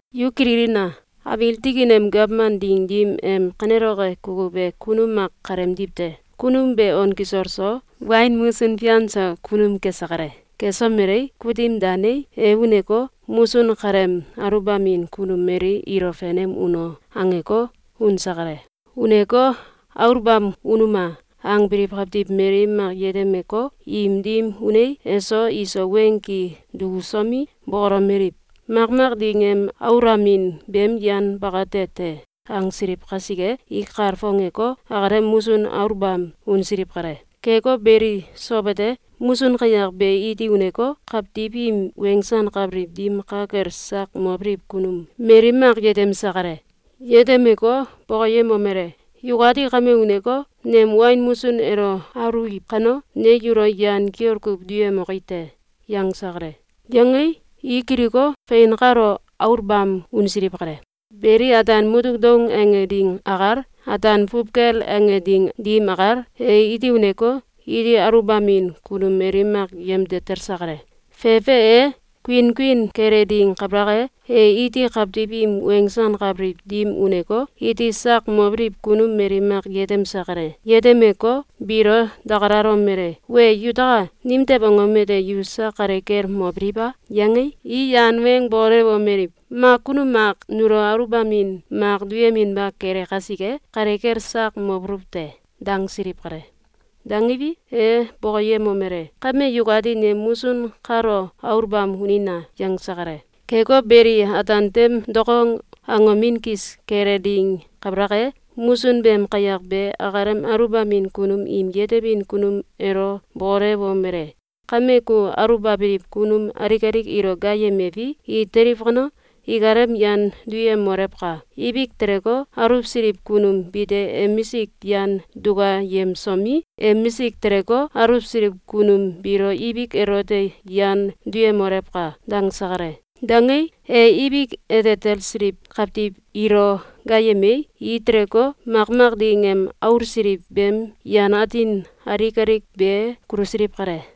Yu kililina! Abiil tikin em gawman ding dim em kaneloke kukuw e kunum mak kaleemdiw te. Kunum be on kisol so, wain musun fian so kunum kese kale. Kesomelei, kutim danei, e uneko, ‘Musun kaleem aluwbamin kunum mali ilo fenem uno!’, angeko, unse kale. Uneko, ‘Aluwbam unuma!’, angbiliw kawtiw mali mak yetemeko, im dim unei, eso iso weng ki dukusomi, bokolomeliw: ‘Makmak ding em aulamin beem yan bakate te.’, angsiliw kasike, i kalfongeko, akalem musun aluwbam unsiliw kale. Keko beli, sow ete, musun kayak be iti uneko, kawtiw im wensankabiliw dim ka kel sak mobiliw kunum mali mak yetemse kale. Yetemeko, bokoyemomele: ‘Yukati kame uneko, nem wain musun elo aluwiw kano, ne yulo yan kiol kuw duyemoki te.’, yangse kale. Yangei, i kiliko, fein kalo aluwbam unsiliw kale. Beli, ataan mutuk doung ange ding akal, ataan fuwkel ange ding dim akal, e iti uneko, iti aluwbamin kunum mali mak yemde talse kale. Fefe e, kuinkuin kele ding kabalak e, e iti kawtiw im wensankabiliw dim uneko, iti sak mobiliw kunum mali mak yetemse kale. Yetemeko, biilo dakalalomele: ‘Wee yutaka! Nimtew angom ete yu sak kale kel mobiliw a?’, yangei, i yan weng bokolewomeliw: ‘Mak kunum mak nulo aluwbamin mak duyeminba kele kasike, kale kel sak mobuluw te.’, dangsiliw kale. Dangiwi, e bokoyemomele: ‘Kame yukati nem musun kalo aluwbam unina!’, yangse kale. Keko beli, ataan tem dokong angomin kis kele ding kabalak e, musun beem kayak be akalem aluwbamin kunum im yetebin kunum elo bokolewomele: ‘Kame ku aluwbabiliw kunum alik alik ilo gaayemewi, i teliw kano, ikalem yan duyemolewka! Ibik teleko, aluwsiliw kunum bite emisik yan dukayemsomi, emisik teleko, aluwsiliw kunum ilo ibik elote yan duyemolewka!’, dangse kale. Dangei, e ibik ete talsiliw kawtiw ilo gaayemei, i teleko, makmak ding em aulsiliw beem yan atin alik alik be kulusiliw kale.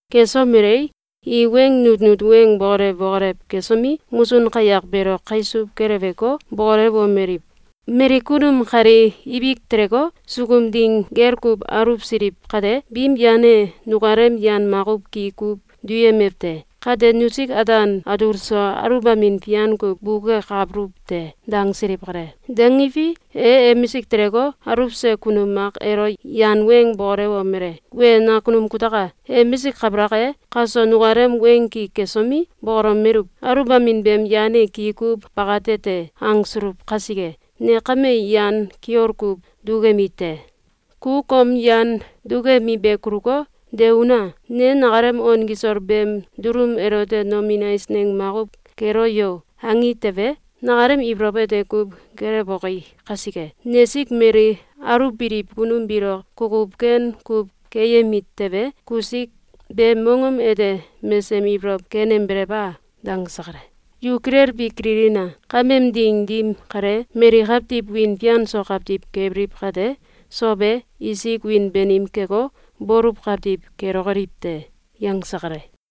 Kesomelei, i weng nutnut weng bokolew bokolew kesomi, musun kayak beelo kaisuw keleweko, bokolewomeliw: ‘Mali kunum kali ibik teleko, sukum ding gel kuw aluwsiliw kate, biim yan e nukalem yan makuw ki kuw duyemew te! Kate nusik ataan atul so aluwbamin fian kuw bukekabuluw te!’, dangsiliw kale. Dangiwi, e emisik teleko, aluwse kunum mak elo yan weng bokolewomele: ‘Wee nakunum kutaka! Emisik kabalak e, kaso nukalem weng ki kesomi, bokolomeluw: ‘Aluwbamin beem yan e ki kuw bakate te.’, angsuluw kasike, ne kame yan kiol kuw dukemi te. Ku kom yan dukemi be kuluko, de una! Ne nakalem on kisol beem dulum elote ‘Nomin eisneng makuw kelo yo!’, angi tewe, nakalem ibolow ete kuw kelewboki kasike. Nesik mali aluwbiliw kunum biilo kukuw ken kuw keyemi tewe, kusik beem mongom ete mesem ibolow kenembelew a?’, dangse kale. Yu kilelbi kililina! Kameem ding dim kale, mali kawtiw wiin fian so kawtiw kebiliw kate, sow e, isik wiin banim keko, baluw kawtiw kelokoliw te.”, yangse kale.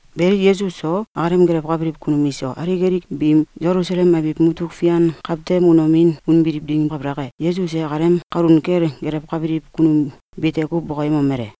Beli, Yesus so, akalem gelewkabiliw kunum iso alik alik biim Selusalem abiw mutuk fian kawtem unomin unbiliw ding kabalak e, Yesus e akalem kalun kel gelewkabiliw kunum bite kuw bokoyemomele: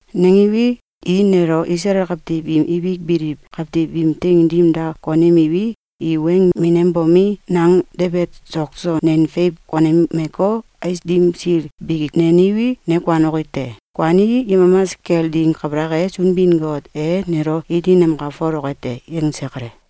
Nangiwi, i nelo Isalael kawtiw im ibik biliw kawtiw im teing dim da konemiwi, i weng minembomi, nang debet sok so nen feiw konemeko, ais dim sil biki neniwi, ne kuanoki te. Kuanii, yemamas kel ding kabalak e, Sunbin-Got e nelo iti namkalfoloke te.”, yangse kale.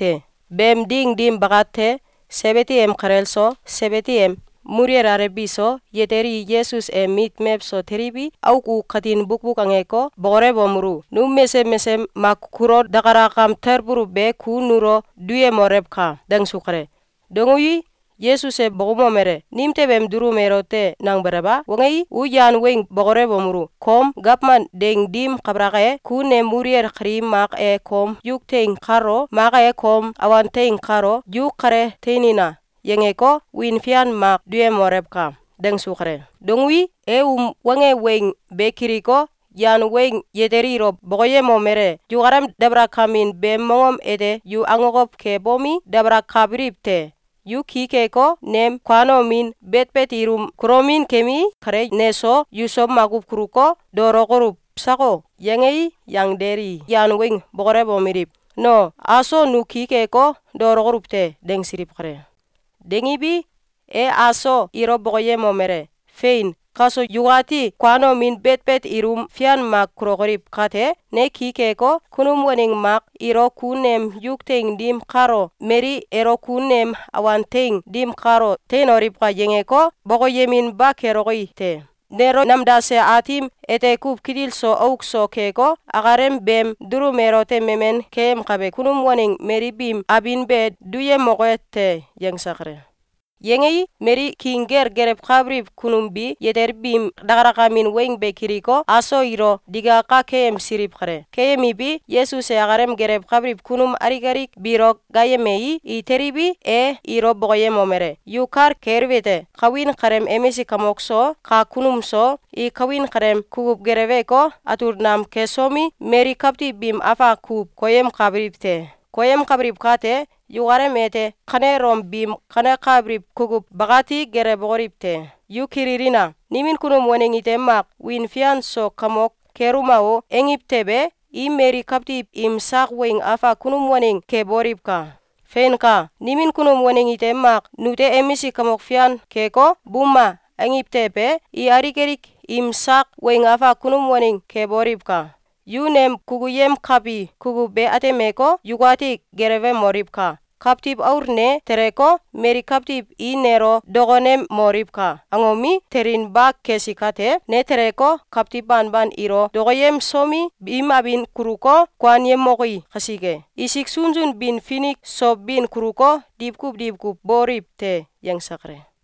Beem ding dim bakate, Sebidi em kalel so, Sebidi em muluwel alew biso, yatel i Yesus em mit mewso teliwi, auk u katin bukbuk angeko, bokolewomelu: “Num mesesem mak kulo dakalakam talbuluw be ku nulo duyemolewka!”, dangsu kale. Dangui, Yesus e bokoumomele: “Nimtew em dulum elote nangbelew a?”, wangei, u yan weng bokolewomelu: “Kom gawman ding dim kabalak e, ku nem muluwel kali mak e kom yuk teing kalo, mak e kom awan teing kalo ‘Yu kale teinina!’, yangeko, wiin fian mak duyemolewka!”, dangsu kale. Dangui, e um wange weng be kiliko, yan weng yatel ilo bokoyemomele: “Yukalem dabalakamin beem mongom ete yu akokow kebomi, dakalakabiliw te! Yu ki keko, nem kuanomin, betbet ilum kulomin kemi kale neso yuso makuw kuluko, daolokoluw sako?”, yangei, yangdel i yan weng bokolewomeliw: “No, aso nu ki keko, daolokoluw te.”, dangsiliw kale. Dangiwi, e aso ilo bokoyemomele: “Fein! Kaso yukati kuanomin, betbet ilum fian mak kulokoliw kate, ne ki keko, kunum waneng mak ilo ‘Ku nem yuk teing dim kalo, mali elo ku nem awan teing dim kalo teinoliwka!’, yangeko, bokoyeminba keloki te. Nelo namdase Aatim ete kuw kitil so auk so keko, akalem beem dulum elote memen keyemkabe kunum waneng mali biim abin be duyemoke te.”, yangse kale. Yangei, mali king kel gelewkabiliw kunum bi yatel biim dakalakemin weng be kiliko, aso ilo digaka keyemsiliw kale. Keyemiwi, Yesus e akalem gelewkabiliw kunum alik alik biilo gaayemei, i teliwi, e ilo bokoyemomele: “Yu kal keliwete: Kawin kaleem emisik kamok so, kak kunum so, i kawin kaleem kukuw geleweko, atul nam kesomi, mali kawtiw biim afak kuw koyemkabiliw te. Koyemkabiliw kate, yukalem ete kanelom biim kanekabiliw kukuw bakati gelewokoliw te! Yu kililina! Nimin kunum waneng ite mak ‘Wiin fian so kamok keluma o!’, angiw tewe, i mali kawtiw im sak weng afak kunum waneng keboliwka! Feinka! Nimin kunum waneng ite mak ‘Nute emisik kamok fian keko, buma!’, angiw tewe, i alik alik im sak weng afak kunum waneng keboliwka! Yu nem kukuyemkabi kukuw be atemeko, yukati gelewemoliwka! Kawtiw Aul ne teleko, ‘Mali kawtiw i nelo dokonemoliwka!’, angomi, telinba kesi kate, ne teleko, kawtiw banban ilo dokoyemsomi, biim abin kuluko, kuanyemoki kasike, isik sunsun bin finik so bin kuluko, diwkuw diwkuw bokoliw te.”, yangse kale.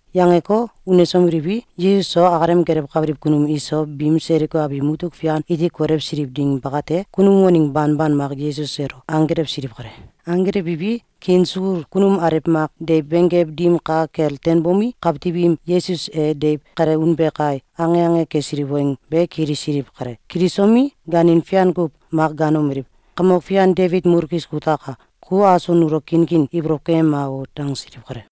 Yangeko, unsomeliwi, Yesus so akalem gelewkabiliw kunum iso biim Seliko abiw mutuk fian iti kolewsiliw ding bakate, kunum waneng banban mak Yesus elo anggelewsiliw kale. Anggelewiwi, kiin sukul kunum alew mak deiw benggew dim ka kel teinbomi, kawtiw im “Yesus e deiw kale unbe kai!”, ange ange kesiliw weng be kilisiliw kale. Kilisomi, gaanin fian kuw mak gaanomeliw: “Kamok Fian Debit mulkis kutaka! Ku aso nulo kinkin ibolow keyema o!”, dangsiliw kale.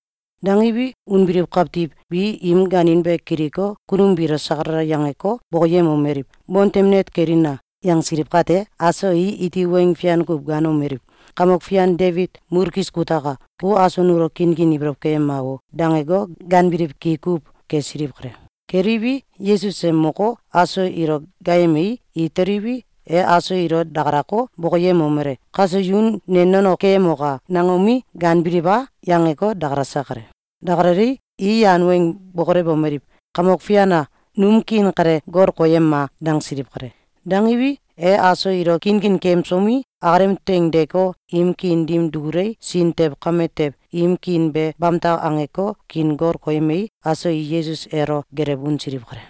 Dangiwi, unbiliw kawtiw bi im gaanin be kiliko, kunum biilo sakalala yangeko, bokoyemomeliw: “Bontem net kelina!”, yangsiliw kate, aso i iti weng fian kuw gaanomeliw: “Kamok Fian Debit mulkis kutaka! Ku aso nulo kinkin ibolow keyema o!”, dangeko, gaanbiliw ki kuw kesiliw kale. Keliwi, Yesus e moko, aso ilo gaayemei, i teliwi, e aso ilo dakalako, bokoyemomele: “Kaso yu ne nono ‘Keyemoka!’, nangomi, gaanbiliw a?”, yangeko, dakalase kale. Dakalalei, i yan weng bokolewomeliw: “Kamok Fian a! Num kiin kale gol koyema!”, dangsiliw kale. Dangiwi, e aso ilo kinkin keyemsomi, akalem teing deeko, im kiin dim dukulei, sin tew kame tew im kiin be bamtak angeko, kiin gol koyemei, aso i Yesus elo gelew unsiliw kale.